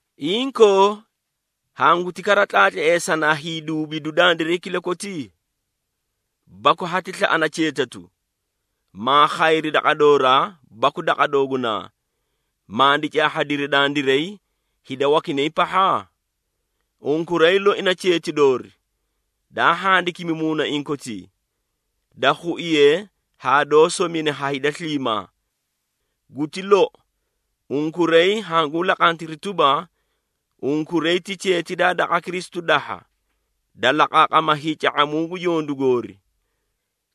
Inkoo, hanguti kara tlaatleesanaa hiiduubidu dandiray kilakoti? Baku hati slaꞌana cheetatu, maa khayri daqa dooraa baku daqa doogunaa, mandi caahhadiri dandiray, hida wakinay pahha? Unkuray loi na cheeti doori, daa handikimi muunaiĩ kotii, da khuiye haa doó somine ha hida sliimaa. Guti lou, unkuray hanguũ laqantiri tuba, unkuray ti cheeti daa daqa Kristu dahha, da laqaaqama hiica⁄amuu gu yondu goori.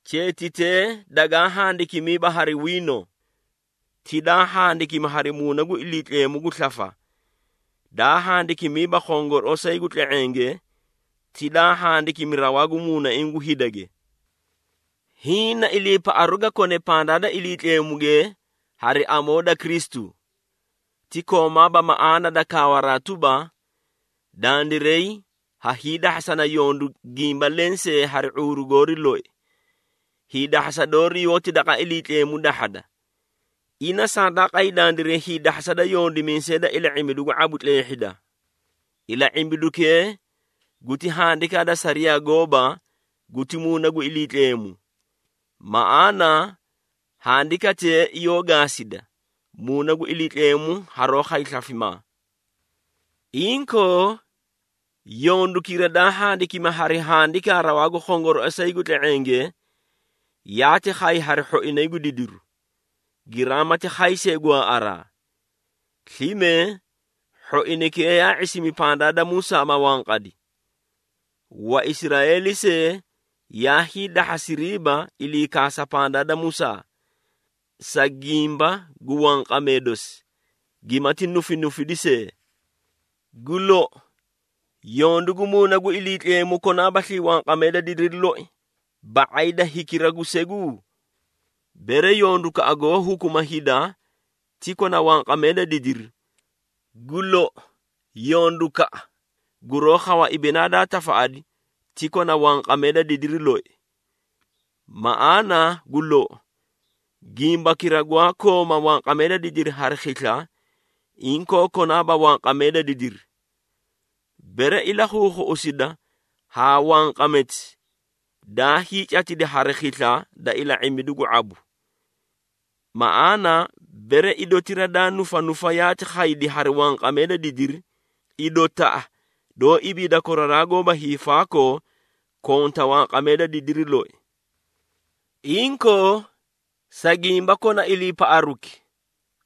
Cheetitee dagaa handikimiiba hari wiino, ti daa handikimi hari Muuna gu Iliitleemu gu slafa, daa handikimiiba khongorooꞌosay gu tle⁄enge, ti daa handikimi rawaa gu muunaiĩ gu hidage. Hiĩ na iliipaꞌaru ga kone pandaa da Iliitleemuge hari amoo da Kristu. Ti koomaaba maꞌaana da kaawaraa tuba, dandiray ha hiidahhasana yondu gimba lensee hari ⁄uuru goori loi. Hiidahhasa doori yoóti daqa Iliitleemu dahhada. Ina sandaa qay dandiray hiidahhasa da yondimiisee da Ila⁄imbidu gu ⁄abu tleehhida. Ila⁄imbidukee guti handikaa da sariyaa gooba guti Muuna gu Iliitleemu. Maꞌaana handikatee yoó gaasida, Muuna gu Iliitleemu haroó khay slafimaa. Inkoo, yondukira daa handikimi hari handikaa rawaa gu khongorooꞌosay gu tle⁄enge, yaati khay hari hhoinay gu didiru, giraamati khay see gwaaꞌaraa. Slime hhoinaykee yaa ⁄isimi pandaa da Musaa ma wanqadi. Waisraeeli see yaa hiidahhasiriiba ilii kaasaraa pandaa da Musaa, sa gimba gu wanqamee dosi, gimati nufinufidi see. Gu lou, yondu gu Muuna gu Iliitleemu konaabaslii wanqamee da didiri loi ba⁄ay da hikira gu segu? Bere yondukaꞌa goó hukuma hida ti kona wanqamee da didiri, gu lou, yondukaꞌa guroó khawa ibinaa daa tafaꞌadi ti konta wanqamee da didiri loi! Maꞌaana gu lou, gimbakira gwaa kooma wanqamee da didiri hari khisla, inkoo konaaba wanqamee da didiri. Bere ilakhuukhuꞌusida haa wanqameti daa hiicatidi hari khisla da ila⁄imbidu gu ⁄abu. Maꞌaana, bere idotira daa nufanufa yaati khaydi hari wanqamee da didiri, idotaꞌa doó ibiida koraraa goóba hiifaakoo konta wanqamee da didiri loi! Inkoo, sa gimba kona iliipaꞌaruki,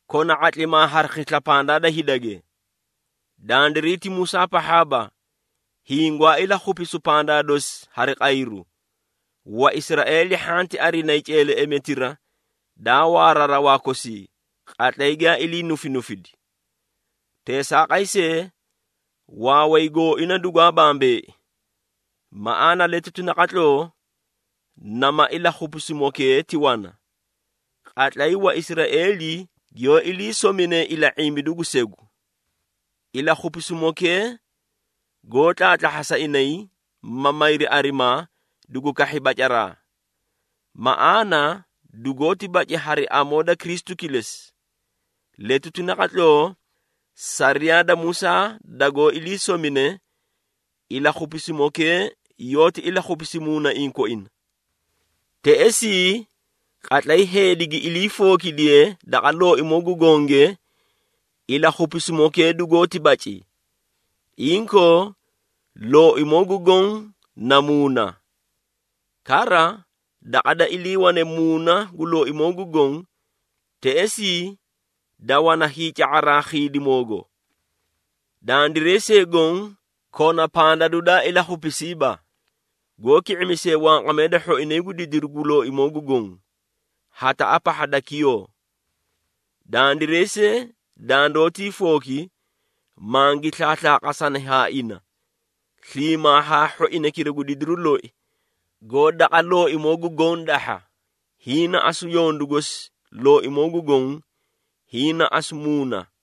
kona ⁄atlimaa hari khisla pandaa da hidage. Dandiray ti Musaa pahhaaba, hiĩ gwaa ilakhupisu pandaa dosi hari qayru, Waisraeeli hhanti arinayi ceeleꞌemetira, daa waara rawaa kosii qatlay giyaa ilii nufinufidi. Teesaaqay see, waaway gooina dugwaa bambeei. Maꞌaana letuti naqatloo, nama ilakhupisimokee ti wana, qatlay Waisraeeli giyoó ilii sominee Ila⁄imbidu gu Segu. Ilakhupisimokee goó tlaatlahhasa inay, ma mayri arimaa, dugu kahhi bacaraa. Maꞌaana dugoóti baci hari amoo da Kristu kilesi. Letuti naqatloo, sariyaa da Musaa dagoó ilii somine, ilakhupisimokee yoóti ilakhupisi muunaiĩ koina. Teꞌesii, qatlay heedi gi iliifookidiye daqa Looimoo gu Gonge, ilakhupisimokee dugoóti baci. Inkoo, Looimoo gu Goõ na Muuna. Kara daqa da iliiwane Muuna gu Looimoo gu Goõ, teꞌesii da wana hiica⁄asaraa khiidimoogo. Dandiray see goõ, kona pandadu daa ilakhupisiiba, goó ki⁄imisee wanqamee da hhoinay gu didiru gu Looimoo gu Goõ, hataꞌa pahha da kiyoo. Dandiray see dandoótii fooki, mangi slaaslaaqasani haa ina, sliimaa haa hhoinaykira gu didiru loi, goó daqa Looimoo gu Goõ dahha. Hiĩ na asu yondu gosi Looimoo gu Goõ, hiĩ na asu Muuna.